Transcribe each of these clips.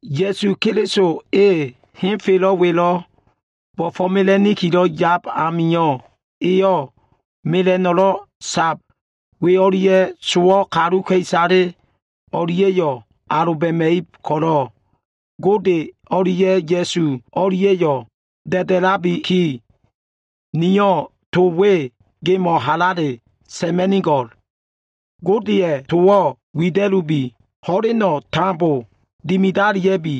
Ya꞉su Keliso e henfelo꞉ welo꞉ bo꞉fo꞉mela꞉nikilo꞉ yab amio꞉, eyo꞉ mela꞉no꞉lo꞉ sab we o꞉lia꞉ sowo꞉ kaluka꞉isale o꞉lia꞉yo꞉ aloba꞉ma꞉ib ko꞉lo꞉, Gode o꞉lia꞉ Ya꞉su o꞉lia꞉yo꞉ da꞉da꞉labiki, niyo꞉ to we gemo꞉ halale sa꞉ma꞉nigo꞉l. Godeya꞉ towo꞉ wida꞉lubi. Ho꞉leno꞉ tambo dimidalia꞉bi.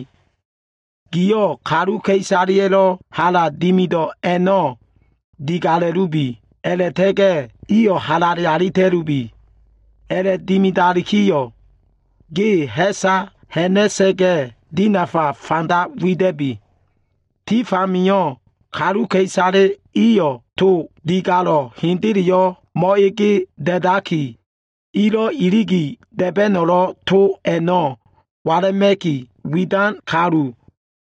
Giyo꞉ kaluka꞉isaleya꞉lo꞉ hala dimido꞉ a꞉no꞉ digala꞉lubi. A꞉la꞉ta꞉ga꞉ iyo꞉ halale alita꞉lubi. A꞉la꞉dimidakiyo꞉, ge ha꞉sa ha꞉na꞉sa꞉ga꞉ dinafa fanda wida꞉bi. Tif amio꞉ kaluka꞉isale iyo꞉ to digalo꞉ hendeleyo꞉ mo꞉ege da꞉daki, ilo꞉ iligi da꞉ba꞉no꞉lo꞉ to ko꞉li nolo꞉ walama꞉ki, widan kalu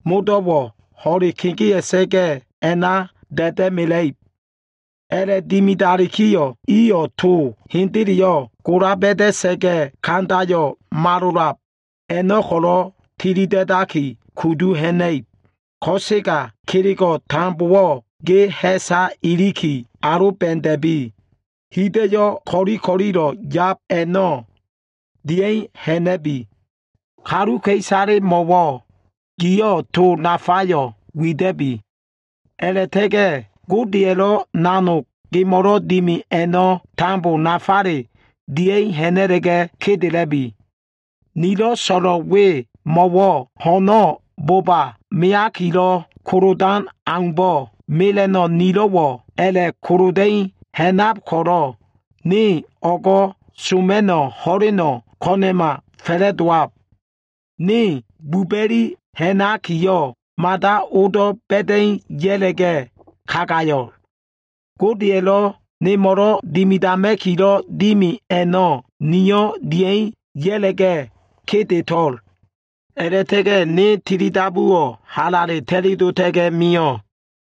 modo꞉wo꞉ ho꞉le kegea꞉sa꞉ga꞉ a꞉na da꞉da꞉mela꞉ib. A꞉la꞉dimidalikiyo꞉, iyo꞉ to hendeleyo꞉ gola ba꞉da꞉sa꞉ga꞉, kandayo꞉ malolab a꞉no꞉ ko꞉lo꞉ tilida꞉daki kudu ha꞉na꞉ib. Ko꞉sega kelego꞉ tambowo꞉ ge ha꞉sa iliki, aloba꞉da꞉bi. Hida꞉yo꞉ ko꞉li ko꞉lilo꞉ yab a꞉no꞉ dia꞉i ha꞉na꞉bi. Kaluka꞉isalemo꞉wo꞉ giyo꞉ to nafayo꞉ wida꞉bi. A꞉la꞉ta꞉ga꞉ Godeya꞉lo꞉ nanog gemo꞉lo꞉ dimi a꞉no꞉ tambo nafale dia꞉i ha꞉na꞉la꞉ga꞉ kedela꞉bi. Nilo꞉ so꞉lo꞉l we mo꞉wo꞉, wa ho꞉no꞉ boba meakilo꞉ kolodan aumbo꞉, mela꞉no꞉ nilo꞉wo꞉ a꞉la꞉koloda꞉i ha꞉nab ko꞉lo꞉, ne o꞉go꞉ soma꞉no꞉ ho꞉leno꞉ ko꞉na꞉ma fa꞉la꞉dowab. Ne buba꞉li ha꞉nakiyo꞉, mada odo꞉ ba꞉da꞉i ya꞉la꞉ga꞉ kagayo꞉. Godeya꞉lo꞉ nemo꞉lo꞉ dimidama꞉kilo꞉ dimi a꞉no꞉ niyo꞉ dia꞉i ya꞉la꞉ga꞉ kedeto꞉l. A꞉la꞉ta꞉ga꞉ ne tilidabuwo꞉ halale ta꞉li dota꞉ga꞉ mio꞉.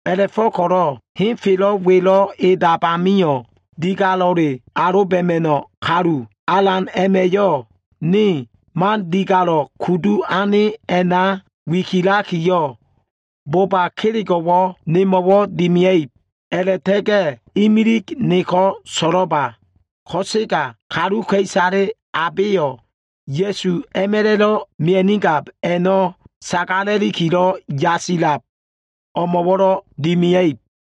A꞉la꞉fo꞉ko꞉lo꞉ henfelo꞉ welo꞉ edab amio꞉, digalelo꞉ aloba꞉ma꞉no꞉ kalu, Alan a꞉ma꞉yo꞉ ne man digalo꞉ kudu ane a꞉na wikilakiyo꞉, boba kelego꞉wo꞉ nemo꞉wo꞉ dimia꞉ib. A꞉la꞉ta꞉ga꞉ imilig neko꞉ so꞉lo꞉ba, ko꞉sega kaluka꞉isale abeyo꞉, Ya꞉su a꞉ma꞉la꞉lo꞉ mia꞉nigab a꞉no꞉ sagala꞉likilo꞉ yasilab o꞉mo꞉wo꞉lo꞉ dimia꞉ib.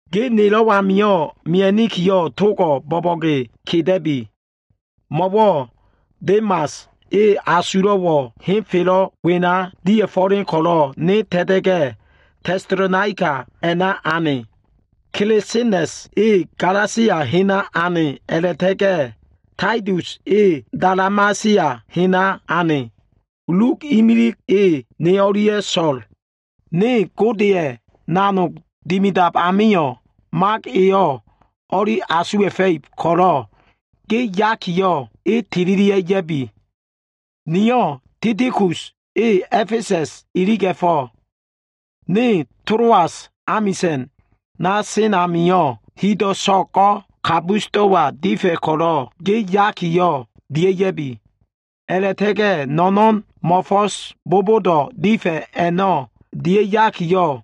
Ge nelo꞉ amio꞉ mia꞉nikiyo꞉, togo꞉ bo꞉bo꞉ge keda꞉bi. Mo꞉wo꞉ Demas, e asulo꞉wo꞉ henfelo꞉ wena dia꞉fo꞉len ko꞉lo꞉ ne ta꞉ta꞉ga꞉, Tesalonaika a꞉na ane. Kelesenas e Galasia hena ane a꞉la꞉ta꞉ga꞉ Taitus e Dalamasia hena ane. Luk imilig e, ne o꞉lia꞉ so꞉l. Ne Godeya꞉ nanog dimidab amio꞉ Mak eyo꞉ o꞉li asuwa꞉fa꞉ib ko꞉lo꞉ ge yakiyo꞉, e tililia꞉ ya꞉bi. Niyo꞉ Tikikus e A꞉fesa꞉s iliga꞉fo꞉. Ne Toloas amisa꞉na sen amio꞉, hido꞉ so꞉go꞉ Kabusdo꞉wa difa꞉ ko꞉lo꞉ ge yakiyo꞉, dia꞉ya꞉bi. A꞉la꞉ta꞉ga꞉ no꞉no꞉n mo꞉fo꞉s bobodo꞉ difa꞉ a꞉no꞉ dia꞉yakiyo꞉,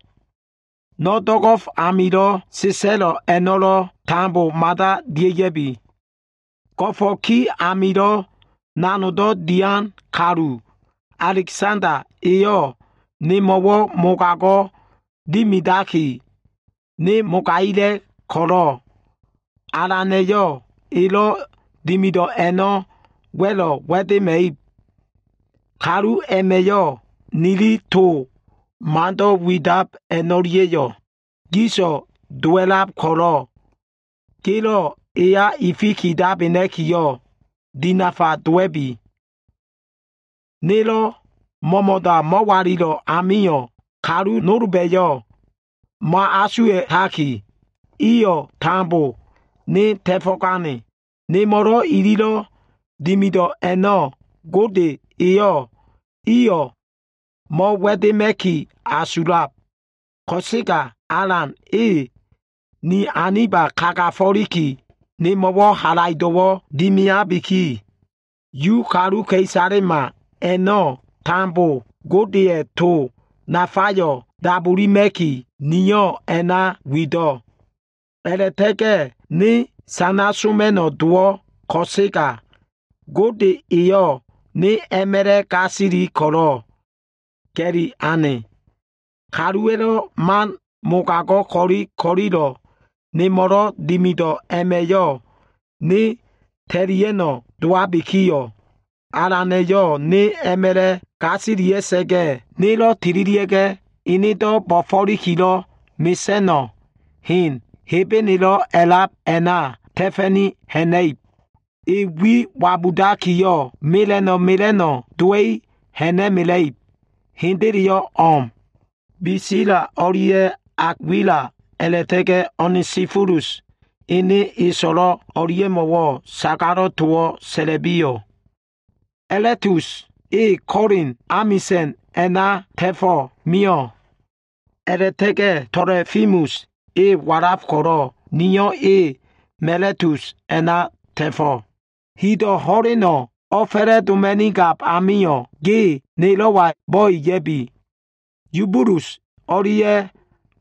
no꞉ do꞉go꞉f amilo꞉ sa꞉sa꞉lo꞉ a꞉no꞉lo꞉ tambowo꞉ mada dia꞉ya꞉bi. Go꞉fo꞉ ki amilo꞉ nanogdo꞉ dian kalu, Alegsanda eyo꞉ nemo꞉wo꞉ mogago꞉ dimidaki ne mogagila꞉ ko꞉lo꞉ Alana꞉yo꞉ elo꞉ dimido꞉ a꞉no꞉ wa꞉lo꞉ wa꞉dema꞉ib. Kalu a꞉ma꞉yo꞉ nili to mando꞉ widab a꞉no꞉lia꞉yo꞉ gis dowa꞉lab ko꞉lo꞉, gelo꞉ eya ifikidabena꞉kiyo꞉ dinafa dowa꞉bi. Nelo꞉ mo꞉mo꞉da mo꞉walilo꞉ amio꞉, kalu nolba꞉yo꞉ mo꞉asuwa꞉taki, iyo꞉ tambo ne ta꞉fo꞉gane. Nemo꞉lo꞉ ililo꞉ dimido꞉ a꞉no꞉ Gode eyo꞉ i a꞉no꞉ mo꞉wa꞉dema꞉ki asulab. Ko꞉sega Alan e ni aniba kagafo꞉liki nemo꞉wo꞉ halaido꞉wo꞉ dimiabiki, Yu kaluka꞉isalema a꞉no꞉ tambo Godeya꞉ to nafayo꞉ dabulima꞉ki, niyo꞉ a꞉na wido꞉. A꞉la꞉ta꞉ga꞉ ne sana soma꞉no꞉ dowo꞉ ko꞉sega, Gode eyo꞉ ne a꞉ma꞉la꞉ gasili ko꞉lo꞉ ga꞉li ane. Kaluwa꞉lo꞉ man mogago꞉ ko꞉li ko꞉lilo꞉ nemo꞉lo꞉ dimido꞉ a꞉ma꞉yo꞉ ne ta꞉lia꞉no꞉ dowabikiyo꞉, Alana꞉yo꞉ ne a꞉ma꞉la꞉ gasilia꞉sa꞉ga꞉, enedo꞉ bo꞉fo꞉likilo꞉ mesa꞉no꞉ hen, Hebenelo꞉ a꞉lab a꞉na ta꞉fa꞉ni ha꞉na꞉ib. E wi wabudakiyo꞉, mela꞉no꞉ mela꞉no꞉ dowa꞉i ha꞉na꞉mela꞉ib. Hendele o꞉m. Bisila o꞉lia꞉ Akwila a꞉la꞉ta꞉ga꞉ Onesifolus ene e so꞉lo꞉ o꞉lia꞉mo꞉wo꞉ sagalo꞉ towo꞉ sa꞉la꞉biyo꞉. Elastus e Kolin amisa꞉n a꞉naka ta꞉fo꞉ mio꞉. A꞉la꞉ta꞉ga꞉ Tolofimus e walaf ko꞉lo꞉ niyo꞉ e Miletus a꞉na ta꞉fo꞉. Hido꞉ ho꞉leno꞉ o꞉fa꞉la꞉doma꞉nigab amio꞉, ge nelo꞉wa bo꞉e ya꞉bi. Yubulus o꞉lia꞉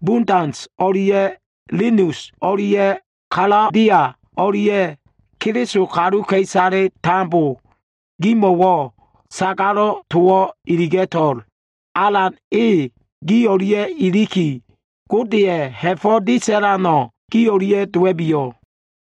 Budens o꞉lia꞉ Linus o꞉lia꞉ Kalodia o꞉lia꞉ Keliso kaluka꞉isale tambo gimo꞉wo꞉ sagalo꞉ towo꞉ iliga꞉to꞉l. Alan e gi o꞉lia꞉ iliki, Godeya꞉ ha꞉fo꞉ disalano꞉ gi o꞉lia꞉ dowa꞉biyo꞉.